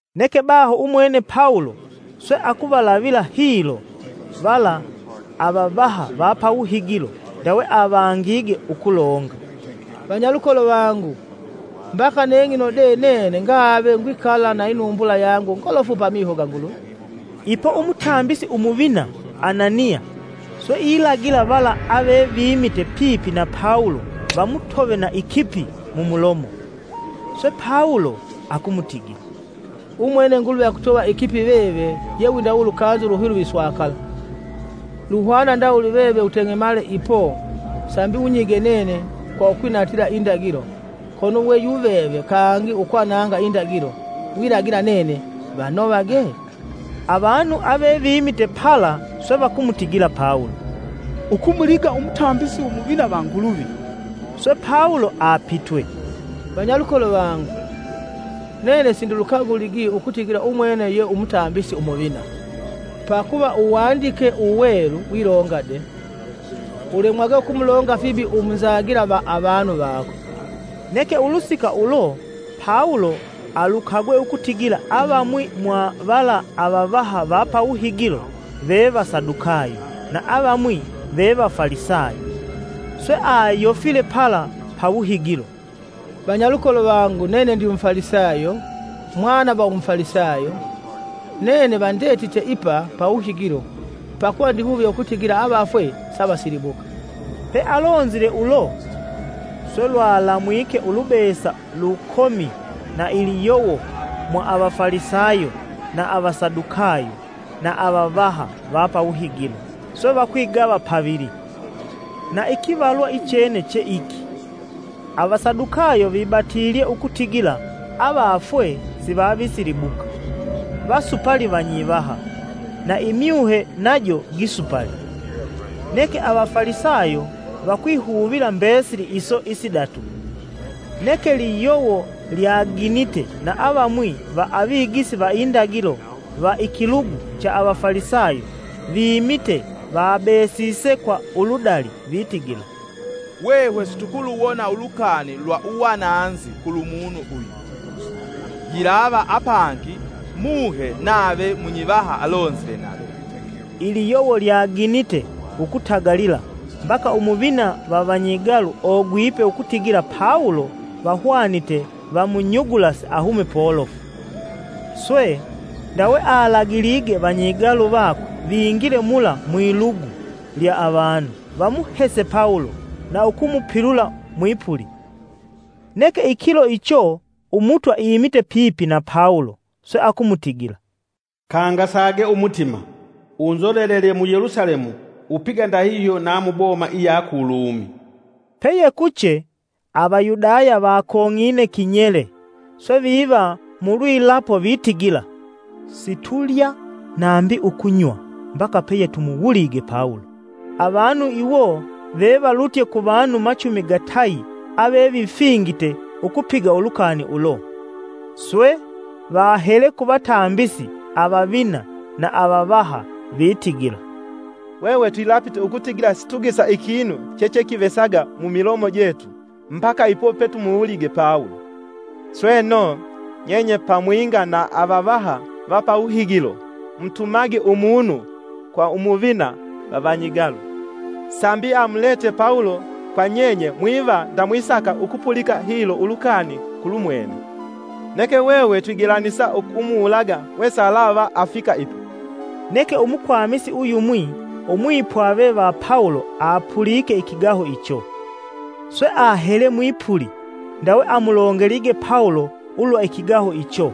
Neke baho umwene Pawulo swe akuvalavila hilo vala avavaha va pawuhigilo, ndawe avangige ukulonga, “Vanyalukolo vangu, mbaka neng'ino de nene ngave ngwikala na inumbula yangu ngolofu pamiho ga Nguluvi.” Ipo umutambisi Umuvina Ananiya swe ilagila vala ave vimite pipi na Pawulo vamutove na ikipi mumulomo. Swe, Pawulo akumutigila, “Umwene Nguluvi akutova ikipi veve yewindawe ulukanzi uluhilive iswakala! Luhwana ndawuli veve uteng'emale ipo sambi unyige nene kwa ukwinatila indagilo kono we yuveve kangi ukwananga indagilo wilagila nene vanovage?” Avanu ave vimite pala swe vakumutigila Pawulo, “Ukumuliga umutambisi Umuvina va Nguluvi!” Swe Pawulo apitwe, “Vanyalukolo vangu, nene sindilukaguligi ukutigila umwene ye Umutambisi Umuvina. Pakuva Uwandike Uwelu wilonga de: ‘Ulemwage ukumulonga fibi umunzagila va avanu vako.’” Neke ulusika ulo Pawulo alukagwe ukutigila avamwi mwa vala avavaha va pawuhigilo veve va Sadukayo na avamwi ve va Falisayo. Swe ayofile pala pawuhigilo: “Vanyalukolo vangu nene ndimufalisayo, mwana va umufalisayo. Nene vandetite ipa pawuhigilo pakuva ndihuvye ukutigila avafwe savasilibuka.” Pealonzile ulo, swe lwalamwike ulubesa lukomi na iliyowo mwa avafalisayo na Avasadukayo na avavaha va pawuhigilo swe vakwigava pavili. Na ikivalwa ichene che iki. Avasadukayo vibatilye ukutigila avafwe sivavisilibuka, vasupali vanyivaha, na imyuhe najo gisupali. Neke Avafalisayo vakwihuvila mbesili iso isidatu. Neke liyowo lyaginite na avamwi va avigisi va indagilo va ikilugu cha Avafalisayo vimite vabesise kwa uludali vitigila, “Hwehwe situkuluwona ulukani lwa uwananzi kulumunu uyu, yilava apangi Muhe nave munyivaha alonzile nave.” Iliyowo lwaginite ukutagalila mbaka umuvina va vanyigalu ogwipe ukutigila Pawulo vahwanite vamunyugulase ahume polofu. Swe, ndawe alagilige vanyigalu vakwe vingile mula mwilugu lya avanu, vamuhese Pawulo na ukumupilula mwipuli. Neke ikilo icho, Umutwa imite pipi na Pawulo, swe akumutigila, “Kangasage Umutima! Unzolelelye mu Yelusalemu, upiga ndahihyo na muboma iya ku Lumi.” Peyekuche, Avayudaya vakong'ine kinyele, swe viva mulwilapo vitigila: “Situlya nambi ukunywa mbaka peyetumuwulige Pawulo.” Avanu iwo vevalutye kuvanu machumi gatayi ave vifingite ukupiga ulukani ulo. Swe, vahele ku vatambisi avavina na avavaha, vitigila, “Hwehwe twilapite ukutigila situgesa ikinu chechekivesaga mumilomo jetu mbaka ipo petumuwulige Pawulo. Sweno, nyenye pamwinga na avavaha va pawuhigilo mutumage umunu kwa umuvina va vanyigalu sambi amulete Pawulo kwa nyenye mwiva ndamwisaka ukupulika hilo ulukani kulumwene. Neke hwehwe twigelanisa ukumuwulaga wesalava afika ipa.” Neke umukwamisi uyumwi umwipwave va Pawulo apulike ikigaho icho, swe ahele mwipuli, ndawe amulongelige Pawulo ulwa ikigaho icho.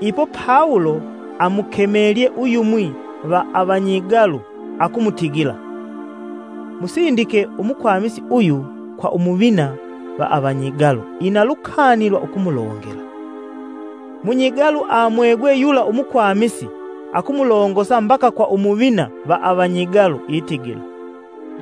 Ipo Pawulo amukemelye uyumwi va avanyigalu, akumutigila, “Musindike umukwamisi uyu kwa umuvina va avanyigalu; ina lukani lwa ukumulongela.” Munyigalu amwegwe yula umukwamisi, akumulongosa mbaka kwa Umuvina va avanyigalu, itigila,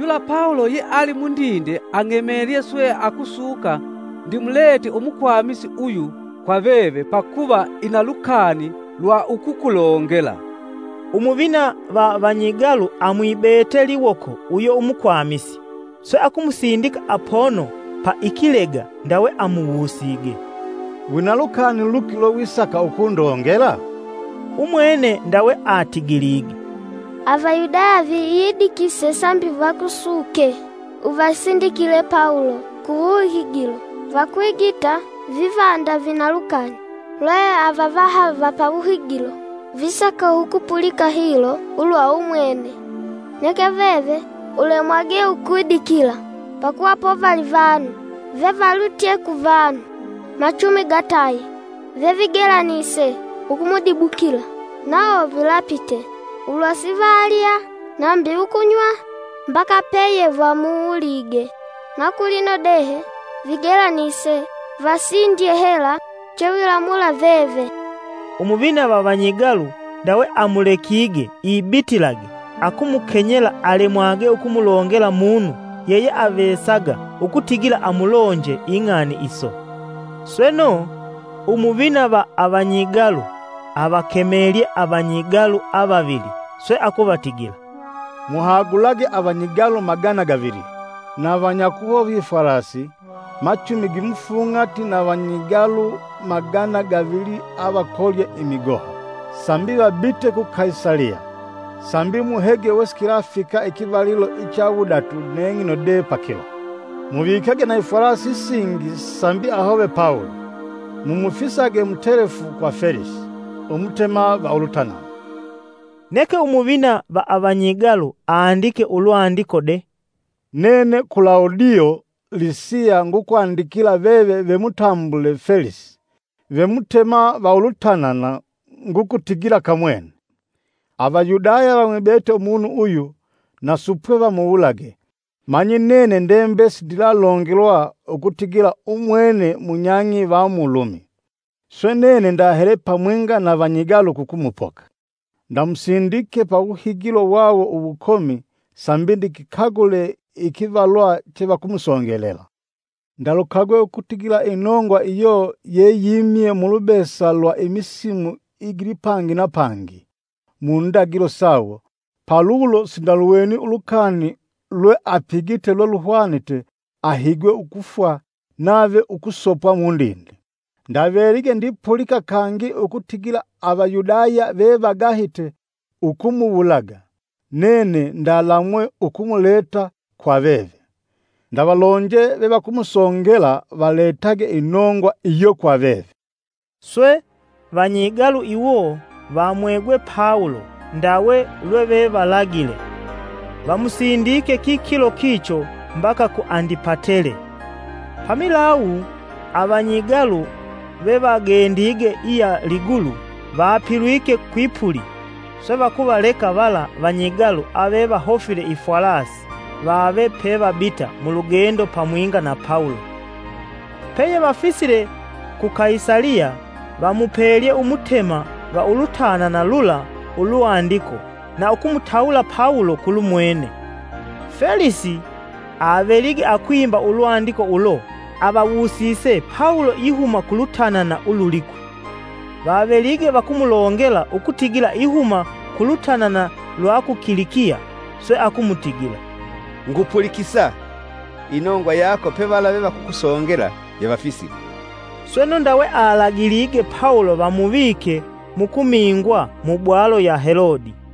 “Yula Pawulo yeali mundinde ang'emelye swe akusuka ndimulete umukwamisi uyu kwa veve pakuva ina lukani lwa ukukulongela.” Umuvina va vanyigalu amwibete liwoko uyo umukwamisi, swe akumusindika apono pa ikilega, ndawe amuwusige, “Wina lukani luki lwewisaka ukundongela?” Umwene ndawe atigilige, “Avayudaya viyidikise sambi vakusuke uvasindikile Pawulo ku wuhigilo vakwigita viva nda vina lukani lwe avavaha va pawuhigilo visaka ukupulika hilo ulwa umwene. Neke veve ulemwage ukwidikila pakuva povali vanu vevalutye kuvanu machumi gatayi vevigelanise ukumudibukila. Nawo vilapite ulwa sivalya nambi ukunywa mbaka peyevamuwulige. Na kulino de vigelanise vasindye hela chewilamula veve.” Umuvina va vanyigalu ndawe amulekige ibitilage akumukenyela alemwage ukumulongela munu yeyeavesaga ukutigila amulonje ing'ani iso. Sweno, umuvina va avanyigalu avakemelye avanyigalu avavili swe akuvatigila, “Muhagulage avanyigalu magana gavili, na vanyakuhova ifwalasi machumi gimufung'ati na vanyigalu magana gavili avakolye imigoha, sambi vabite ku Kaisaliya; sambi muhege wesikilafika pakivalilo icha wudatu neng'ino de pakilo. Muvikage na ifwalasi isingi sambi ahove Pawulo, mumufisage mutelefu kwa Felisi, umutema va ulutanana.” Neke umuvina va avanyigalu andike ulwandiko de: “Nene Kulawudio Lisiya ngukwandikila veve ve mutambule Felisi, ve Mutema va ulutanana. Ngukutigila Kamwene! “Avayudaya vamwibete umunu uyu na supwe vamuwulage manyi nene ndendive sindilalongelwa ukutigila umwene munyang'i va mu Lumi swe nene ndahele pamwinga na vanyigalu ukumupoka. Ndamusindike pawuhigilo wawo uwukomi sambi ndikikagule ikivalwa chevakumusongelela. Ndalukagwe ukutigila inongwa iyo yeyimye mulubesa lwa imisimu igilipangi na pangi mundagilo sawo palulo sindaluweni ulukani lweapigite lweluhwanite ahigwe ukufwa nave ukusopwa mundinde. Ndavelige ndipulika kangi ukutigila Avayudaya vevagahite ukumuwulaga, nene ndalamwe ukumusindika kwa veve. Ndalonje vevakumusongela valetage inongwa iyo kwa veve.” Swe, vanyigalu iwo vamwegwe Pawulo ndawe lweve valagile; vamusindike kikilo kicho mbaka ku Andipatele. Pamilawu avanyigalu vevagendige iya ligulu vapilwike kwipuli, swe vakuvaleka vala vanyigalu avevahofile ifwalasi vave pevabita mulugendo pamwinga na Pawulo. Peyevafisile ku Kaisaliya vamupelye umutema va ulutanana lula ulwandiko na ukumutawula Pawulo kulumwene. Felisi avelige akwimba ulwandiko ulo avawusise Pawulo ihuma ku lutanana ululikwi. Vavelige vakumulongela ukutigila ihuma ku lutanana lwa ku Kilikiya, swe akumutigila, “Ngupulikisa inongwa yako pevala vevakukusongela yevafisile.” Sweno ndawe alagilige Pawulo vamuvike mukumingwa mu bwalo ya Helodi.